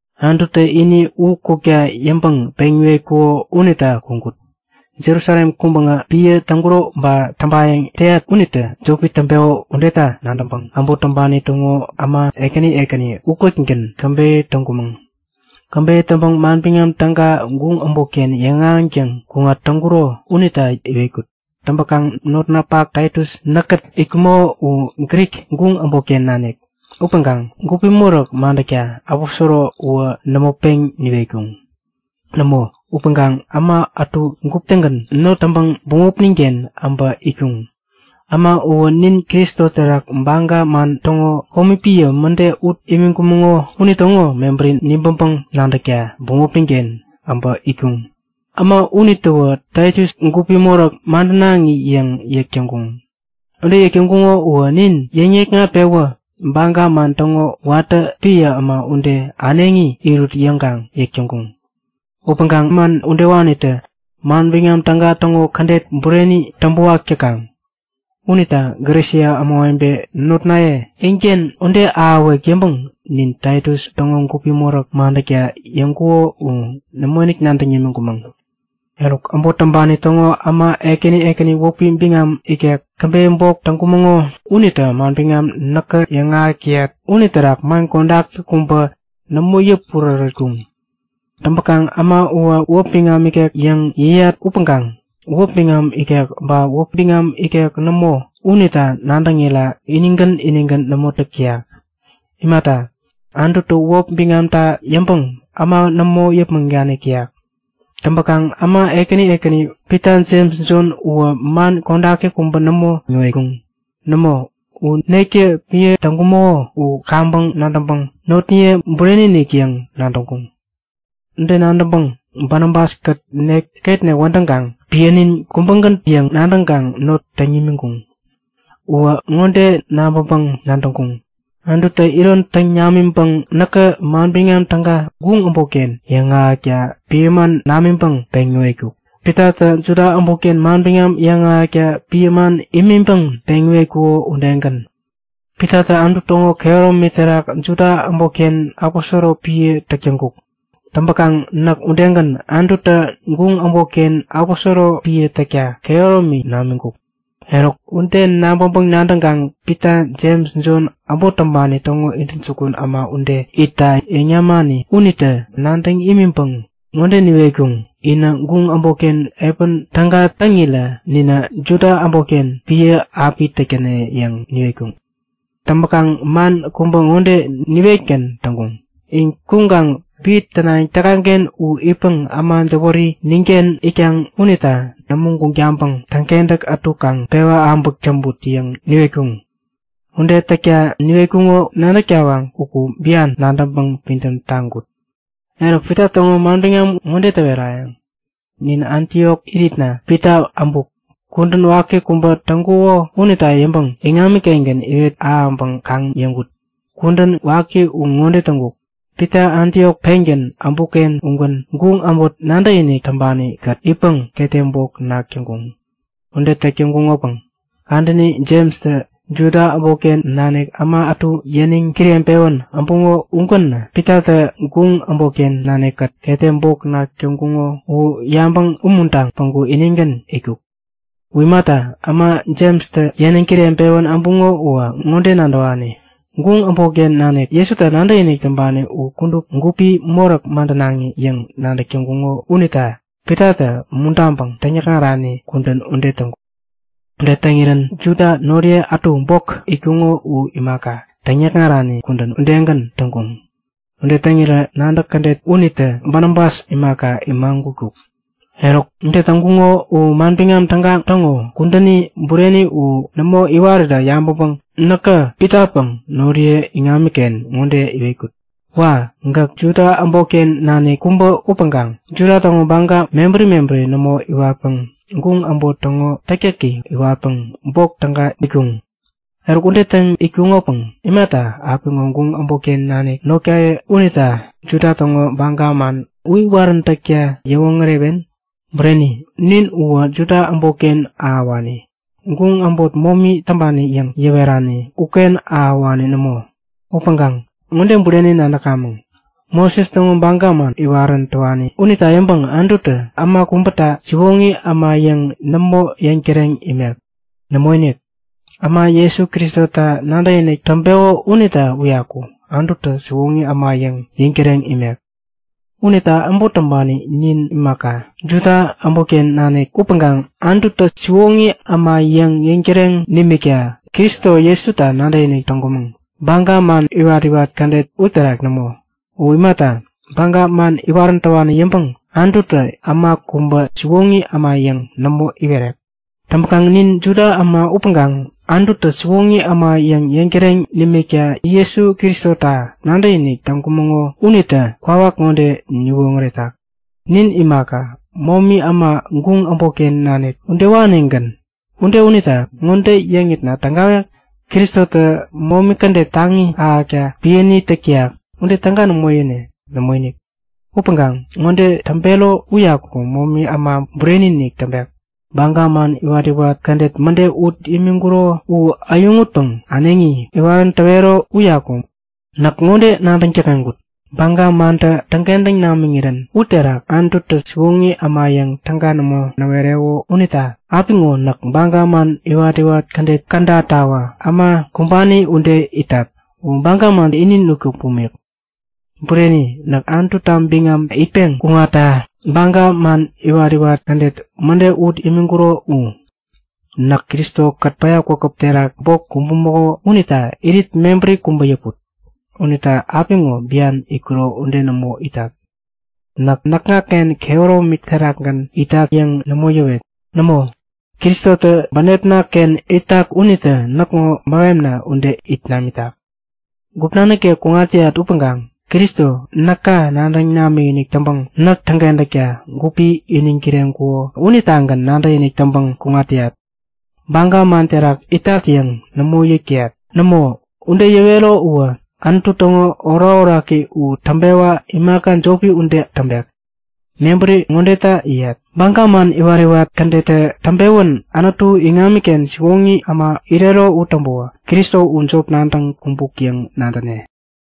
Anututä ini u kukta yäŋpäŋ peŋ näwetkuko unita kuŋkut. Jerusalem kuŋpäŋä piä täŋkuro ba täŋpayäŋ täyat unitä jopi täŋpeko udeta nadäŋpäŋ äbot täŋpani täŋo äma ekäni ekäni ukätgän käbeyä täŋkumäŋ. Käbeyä täŋpäŋ Manbiŋam Täga guŋ äbotken yäŋahäŋtäŋ kuŋat täŋkuro unita yäwetkut. Täŋpäkaŋ notnapak Taitus, näkkät itkumäko u Grik, guŋ äbotken nanik upäŋkaŋ gupi moräk madäkta aposoro uwä nämo peŋ niwetkuŋ. Nämo, upäŋkaŋ äma ätu gupi-tägän not täŋpäŋ bämopnin-ken äbä itkuŋ. Äma uwä nin Kristo terak baga man täŋo komi piä mäde ut imiŋkumäŋo unitäŋo mebäri nibäŋpäŋ nadäkta bämopnin-ken äbä itkuŋ. Äma unitäwä Taitus gupi moräk madänaŋi yäŋ yäk täŋkuŋ. Ude yäk täŋkuŋo uwä nin yäŋ-nikŋat-pewä baga man täŋo watä piä äma ude äneŋi irut yäŋkaŋ yäk täŋkuŋ. Upäŋkaŋ man udewanitä Manbiŋam Täga täŋo kädet bureni täŋpäwak täkaŋ. Unita Galesia ämawebe notnaye inken ude ahäwek yäŋpäŋ nin Taitus täŋo gupi moräk madäkta yäŋkuŋo u nämoinik nadäŋ yämiŋkumäŋ. Eruk, äbot täŋpani täŋo äma ekäni ekäni wäpi biŋam ikek käbeyä bok täŋkumäŋo unitä manbiŋam näkä yäŋahäk täyat uniterak man kodaki kubä nämo yäpurärätkuŋ. Täŋpäkaŋ äma uwä wäp biŋam ikek yäŋ yäyat upäŋkaŋ wäp biŋam ikek ba wäp biŋam ikek nämo, unita nadäŋira inigän inigän nämo täk täyak. Imata, Anututä wäp biŋamta yäŋpäŋ äma nämo yäpmäŋ danik täyak. Täŋpäkaŋ äma ekäni ekäni Pita, Jems, Jon uwä man kodaki kubä nämo näwetkuŋ. Nämo, u nektä piä täŋkumäko u kaŋpäŋ nadäŋpäŋ notniye bureni-inik yäŋ nadäŋkuŋ. Ude nadäŋpäŋ Banabas-kät nek ketnek wädäŋkaŋ piänin kubägän yäŋ nadäŋkaŋ not täŋ nimiŋkuŋ. Uwä ŋode nabäŋpäŋ-nadäŋkuŋ; Anututä iron täŋ namiŋpäŋ näkä Manbiŋam Täga guŋ äbotken yäŋahäkta piä man namiŋpäŋ peŋ näwetkuk, Pitatä Juda äbotken manbiŋam yäŋahäkta piä man imiŋpäŋ peŋ iwetkuko udegän. Pitatä Anutu täŋo kehäromi terak Juda äbotken aposoro piä täk täŋkuk. Täŋpäkaŋ näk udegän, Anututä guŋ äbotken aposoro piä täkta kehäromi namiŋkuk. Eruk, ude nabäŋpäŋ-nadäŋkaŋ Pita, Jems, Jon, äbot täŋpani täŋo intäjukun äma ude itta yäŋ yämani unitä nadäŋ nimiŋpäŋ ŋode niwetkuŋ; Inä guŋ äbotken piä täga täŋirä ninä Juda äbotken piä api täk täne yäŋ niwetkuŋ. Täŋpäkaŋ man kubä ŋode niwetgän täŋkuŋ; In kuŋkaŋ piä tänayäŋ täkaŋ-ken u itpäŋ äma jäwäri ninken itkaŋ unita nämo guŋ taŋpäŋ täŋkentäk ätu kaŋ pewä äbäk täŋput yäŋ niwetkuŋ. Ude täkta niwetkuŋo nadäk tawaŋ uku bian nadäŋpäŋ pidäm taŋkut. Eruk Pita täŋo manbiŋam ŋode täwerayäŋ; Nin Antiok iritna Pita äbuk. Äbänä kudän waki kubä täŋkuko unita yäŋpäŋ iŋami-kengän iwet ahäŋpäŋ kaŋ-yäŋkut. Kudän waki u ŋode täŋkuk; Pitatä Antiok pengän äbukken ugän guŋ äbot nadäkinik täŋpani-kät itpäŋ ketem bok nak täŋkuŋ. Ude täk täŋkukopäŋ kadäni Jemstä Juda äbotken nanik äma ätu yäniŋ kireŋpewän äbuŋo ugänä Pitatä guŋ äbotken nanikkät ketem bok nak täŋkuŋo u yabäŋ umuntaŋ päŋku inigän itkuk. U imata, äma Jemstä yäniŋ kireŋpewän äbuŋo uwä ŋode nadäwani; Guŋ äbotken nanik Jesuta nadäkinik täŋpani u kudup gupi moräk madänaŋi yäŋ nadäk täŋkuŋo unita Pitatä umuntaŋpäŋ täŋyäkŋarani kudän ude täŋkuk. Ude täŋirän Juda noriye ätu bok itkuŋo u imaka, täŋyäkŋarani kudän u udegän täŋkuŋ. Ude täŋirä nadäk kädet unitä Banabas imaka imagutkuk. Eruk, ude täŋkuŋo u Manbiŋam Täga täŋo kudäni bureni u nämo iwarirä yabäŋpäŋ näkä Pitapäŋ noriye iŋamiken ŋode iwetkut; Wa! Gäk Juda äbotken nanik kubä upäŋkaŋ Juda täŋo baga mebäri mebäri nämo iwatpäŋ guŋ äbot täŋo täktäki iwatpäŋ bok täga itkuŋ. Eruk, ude täŋ itkunopäŋ imata apiŋo guŋ äbotken nanik notkaye unita Juda täŋo baga man u iwaräntäkta yäwoŋärewen? Bureni, nin uwä Juda äbotken ahäwani, guŋ äbot momi täŋpani yäŋ yäwerani uken ahäwani nämo. Upäŋkaŋ ŋode bureni nadäkamäŋ; Moses täŋo baga man iwarän täwani unita yäŋpäŋ Anututä äma kubäta siwoŋi äma yäŋ nämo yäŋtäreŋ imek. Nämoinik. Äma Jesu Kristota nadäkinik täŋpeko unita uyaku Anututä siwoŋi äma yäŋ yäŋtäreŋ imek. Unita äbot täŋpani nin imaka, Juda äbotken nanik upäŋkaŋ Anututä siwoŋi äma yäŋ yäŋtäreŋ nimikta Kristo Jesuta nadäkinik täŋkumäŋ. Baga man iwat-iwat kädet uterak nämo. U imata, baga man iwarän täwani yäŋpäŋ Anututä äma kubä siwoŋi äma yäŋ nämo iwerek. Täŋpäkaŋ nin Juda äma upäŋkaŋ Anututä siwoŋi äma yäŋ yäŋtäreŋ nimikta Jesu Kristota nadäkinik täŋkumäŋo unitä kwawak ŋode niwoŋäretak; Nin imaka, momi äma, guŋ äbotken nanik udewanigän. Ude unita ŋode yäŋitna tägawek? Kristotä momi kädet taŋi ahäkta piäni täk täyak. Ude täga nämo yäne! Nämoinik! Upäŋkaŋ ŋode täŋpero uyaku momi äma bureni-inik täŋpet; Baga man iwat-iwat kädet mäde ut imiŋkuro u äyäŋutpäŋ äneŋi iwarän täwero uyaku. Näk ŋode nadäŋ däkŋeŋkut; Baga mantä täŋkentäŋ namiŋirän uterak Anututä siwoŋi äma yäŋ täga nämo näwereko unita apiŋo näk baga man iwat-iwat kädet kädatawä äma kumbani ude itat. Uwä baga mantä ini nutkuk bumik. Bureni, näk Anututa biŋam itpeŋ kuŋatta baga man iwat-iwat kädet mäde ut imiŋkuro u. Näk Kristo-kät päya kwakäp terak bok kumbumäko unita irit mebäri kubä yäput. Unita apiŋo bian itkuro ude nämo itat. Näk näkŋaken kehäromi terakgän itat yäŋ nämo yäwet. Nämo, Kristotä bänepna-ken itak unitä näkŋo mähemna ude it namitak. Gupna nikek kuŋat täyat upäŋkaŋ Kristo, näka nadäŋ namikinik täŋpäŋ näk täŋkentäkta gupi iniŋ kireŋkuko unitagän nadäkinik täŋpäŋ kuŋat täyat. Baga man terak itat yäŋ nämo yäk täyat. Nämo, ude yäwero uwä Anutu täŋo orakoraki u täŋpewa imaka jopi ude täŋpek. Mebäri ŋodeta yäyat; Baga man iwat-iwat kädettä täŋpewän Anutu iŋamiken siwoŋi äma irero u täŋpäwä Kristo u jop nadäŋ kumbuk yäŋ nadäne.